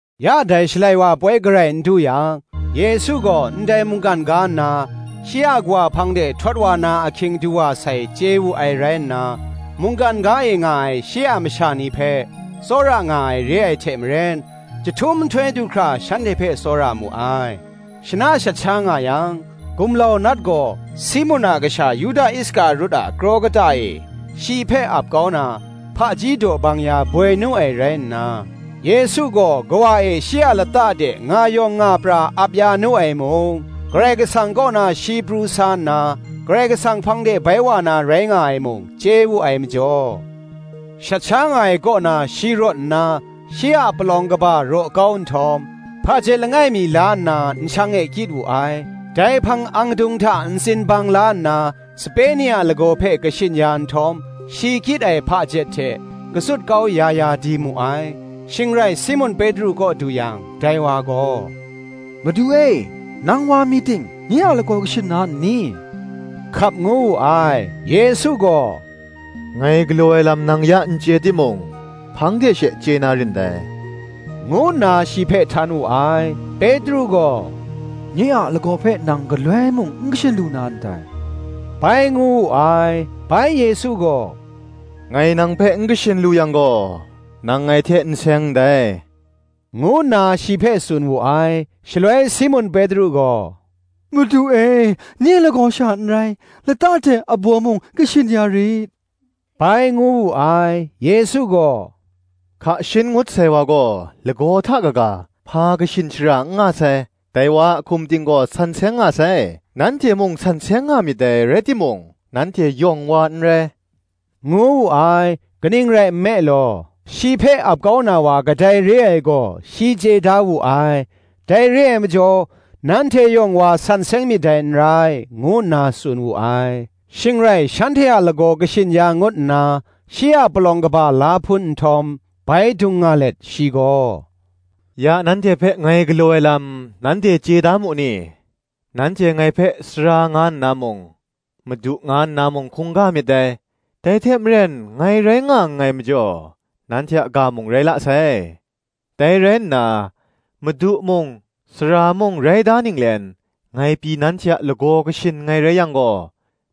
Ya dai Shalai wa ai poi garai n du yang, Yesu gaw ndai mungkan ga nna, shi a Kawa hpang de htawt wa na ahkying du wa sai, chye wu ai rai nna, mungkan ga e nga ai shi a masha ni hpe tsawra nga ai re ai hte maren, jahtum nhtoi du hkra shanhte hpe tsawra mu ai. Shana shat sha nga yang, gumlau Nat gaw Simun a kasha Yuda Iskarut a kraw kata e shi hpe ap kau na, hpaji daw bang ya boi nu ai rai nna, Yesu gaw Kawa e shi a lata de nga yawng nga pra ap ya nu ai mung, Karai Kasang kaw na shi pru sa nna, Karai Kasang hpang de bai wa na rai nga ai mung, chye wu ai majaw, shat sha nga ai kaw na shi rawt nna, shi a palawng kaba raw kau nhtawm, hpajet langai mi la nna nshang e kyit wu ai. Dai hpang angdung hta ntsin bang la nna, sape ni a lagaw hpe kashin ya nhtawm, shi kyit ai hpajet hte katsut kau ya ya di mu ai. Shing rai Simun Petru kaw du yang, dai wa gaw, “Madu e, nang wa mi ting, nye a lagaw kashin na nni?” hkap ngu wu ai. Yesu gaw, “Ngai galaw ai lam nang ya n chye timung, hpang de she chye na rin dai,” ngu nna shi hpe htan wu ai. Petru gaw, “Nye a lagaw hpe nang galoi mung n kashin lu na ndai,” bai ngu wu ai. Bai Yesu gaw, “Ngai nang hpe n kashin lu yang gaw nang ngai hte n seng ndai,” ngu nna shi hpe tsun wu ai. Shaloi Simun Petru gaw, “Madu e, nye lagaw sha n rai, lata hte abaw mung kashin ya rit,” bai ngu wu ai. Yesu gaw, “Hka shin ngut sai wa gaw, lagaw hta kaga, hpa kashin shara n nga sai: dai wa a hkum ting gaw san seng nga sai; nanhte mung san seng nga myit dai, rai timung, nanhte yawng wa n rai,” ngu wu ai. Kaning rai nme law, shi hpe ap kau na wa kadai re ai gaw, shi chye da wu ai: dai re ai majaw, Nanhte yawng wa san seng myit dai n rai, ngu nna tsun wu ai. Shing rai shanhte a lagaw kashin ya ngut nna, shi a palawng kaba la hpun nhtawm, bai dung nga let shi gaw, “Ya nanhte hpe ngai galaw ai lam, nanhte chye da mu ni? Nanhte ngai hpe, Sara nga nna mung, Madu nga nna mung, hkungga myit dai: dai hte maren ngai rai nga nngai majaw, nanhte a ga mung rai la sai. Dai rai nna, Madu mung, Sara mung rai da ninglen, ngai pyi nanhte a lagaw kashin nngai rai yang gaw,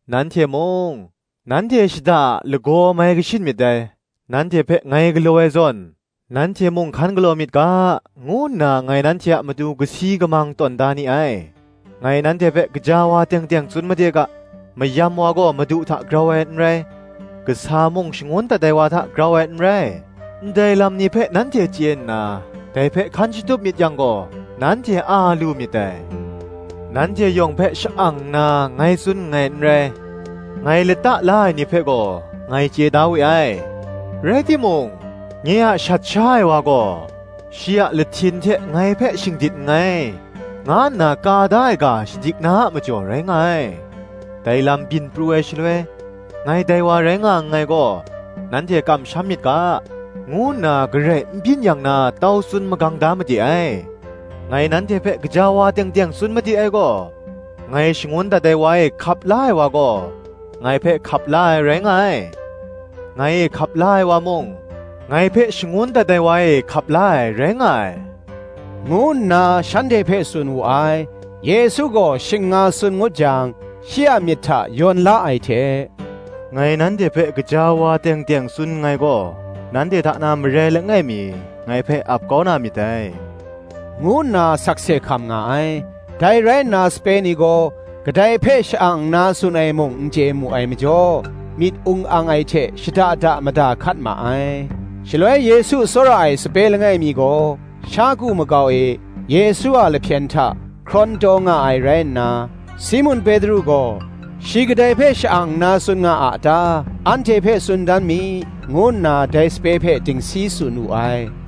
nanhte mung, nanhte shada a lagaw mai kashin myit dai. Nanhte hpe ngai galaw ai zawn, nanhte mung hkan galaw myit ga, ngu nna ngai nanhte a matu kasi kamang tawn da ni ai. Ngai nanhte hpe gaja wa teng teng tsun made ga, Mayam wa gaw madu hta grau ai n rai, kasa mung shangun dat ai wa hta grau ai n rai. Ndai lam ni hpe nanhte chye nna, dai hpe hkan shatup myit yang gaw, nanhte a lu myit dai. Nanhte yawng hpe sha-ang nna ngai tsun nngai n rai: ngai lata la ai ni hpe gaw, ndai chye da we ai: rai timung, Nye a shat sha ai wa gaw, shi a lahtin hte ngai hpe shingdit nngai, nga nna ka da ai ga shadik na a majaw rai nga ai. Dai lam byin pru ai shaloi, ngai dai wa rai nga nngai gaw, nanhte kamsham myit ga, ngu nna garai n byin yang na tau tsun magang da made ai. Ngai nanhte hpe gaja wa teng teng tsun made ai gaw, Ngai shangun dat ai wa e hkap la ai wa gaw, ngai hpe hkap la ai, rai nga ai: ngai e hkap la ai wa mung, ngai hpe shangun dat ai wa e hkap la ai, rai nga ai,” ngu nna shanhte hpe tsun wu ai. Yesu gaw shing nga tsun ngut jang, shi a myit hta yawn la ai hte, “Ngai nanhte hpe gaja wa teng teng tsun nngai gaw, Nanhte hta na marai langai mi, ngai hpe ap kau na myit dai,” ngu nna sakse hkam nga ai. Dai rai nna sape ni gaw, kadai hpe sha-ang nna tsun ai mung n chye mu ai majaw, myit ung ang ai hte shada da mada hkat ma ai. Shaloi Yesu tsawra ai sape langai mi gaw, sha ku makau e, Yesu a lahpyen hta hkrawn taw nga ai rai nna, Simun Petru gaw, “Shi kadai hpe sha-ang nna tsun nga a ta, anhte hpe tsun dan mi,” ngu nna dai sape hpe dingsi tsun wu ai.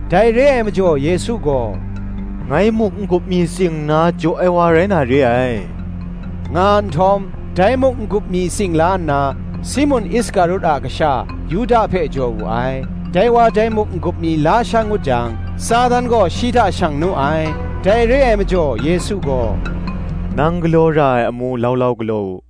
Dai re ai majaw Yesu gaw, “Ngai muk n-gup mi tsing nna jaw ai wa rai na re ai,” nga nhtawm, dai muk n-gup mi tsing la nna, Simun Iskarut a kasha Yuda hpe jaw wu ai. Dai wa dai muk n-gup mi la sha ngut jang, Satan gaw shi hta shang nu ai. Dai re ai majaw, Yesu gaw, “Nang galaw ra ai amu lau lau galaw u,”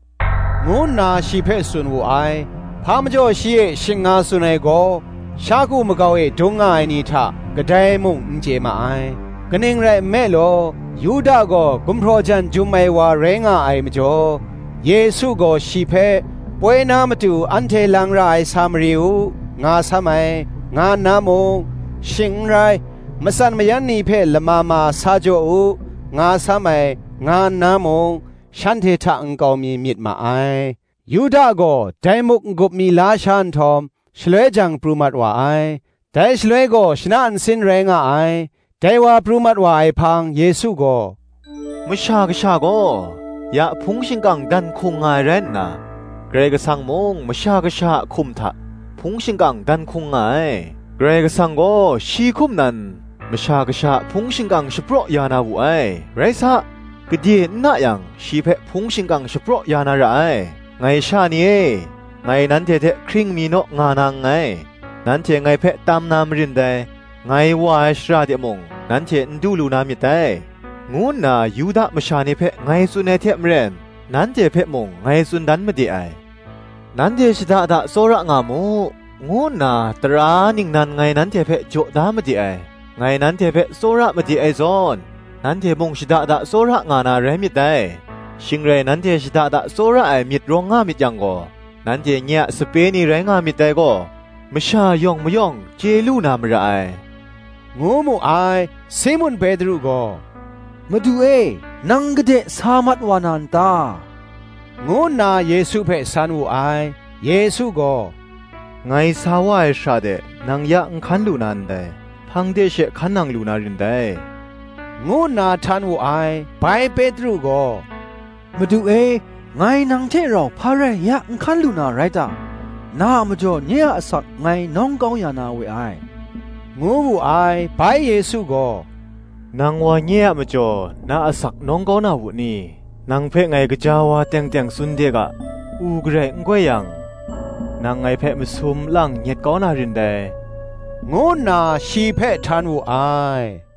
ngu nna shi hpe tsun wu ai. Hpa majaw shi e shing nga tsun ai gaw, sha ku makau e dung nga ai ni hta, kadai mung n chye ma ai. Kaning rai nme law, Yuda gaw gumhpraw jan jum ai wa rai nga ai majaw, Yesu gaw shi hpe, Poi na matu anhte lang ra ai sa mari u, nga sam ai, nga nna mung, shing n rai, Matsan mayan ni hpe lama ma sa jaw u, nga sam ai, nga nna mung, shanhte hta nkau mi myit ma ai. Yuda gaw dai muk n-gup mi la sha nhtawm, shaloi jang pru mat wa ai: dai shaloi gaw shana nsin rai nga ai. Dai wa pru mat wa ai hpang Yesu gaw, “Masha Kasha gaw, ya hpung shingkang dan hkung nga ai rai nna, Karai Kasang mung Masha Kasha a hkum hta hpung shingkang dan hkung nga ai. Karai Kasang gaw shi hkum nan Masha Kasha a hpung shingkang shapraw ya na wu ai: rai sa, gade n na yang shi hpe hpung shingkang shapraw ya na ra ai. Ngai sha ni e, ngai nanhte hte hkring mi naw nga na nngai. Nanhte ngai hpe tam na marin dai: Ngai wa ai shara de mung nanhte n du lu na myit dai, ngu nna Yuda masha ni hpe ngai tsun ai hte maren, nanhte hpe mung ngai tsun dan made ai. Nanhte shada da tsawra nga mu, ngu nna tara ningnan ngai nanhte hpe jaw da made ai: ngai nanhte hpe tsawra made ai zawn, nanhte mung shada da tsawra nga na rai myit dai. Shing rai nanhte shada tsawra ai myit rawng nga myit yang gaw, nanhte nye a sape ni rai nga myit dai gaw, masha yawng mayawng chye lu na mara ai,” ngu mu ai. Simun Petru gaw, “Madu e, nang gade sa mat wa na n ta?” ngu nna Yesu hpe san wu ai. Yesu gaw, “Ngai sa wa ai shara de, nang ya n hkan lu na ndai, hpang de she hkan nang lu na rin dai,” ngu nna htan wu ai. Bai Petru gaw, “Madu e, ngai nang hte rau hpa rai ya n hkan lu na rai ta? Na a majaw nye a asak ngai nawng kau ya na we ai,” ngu wu ai. Bai Yesu gaw, “Nang wa nye a majaw, na asak nawng kau na wu ni? Nang hpe ngai gaja wa teng teng tsun de ga, U garai n goi yang, nang ngai hpe masum lang nyet kau na rin dai,” ngu nna shi hpe htan wu ai.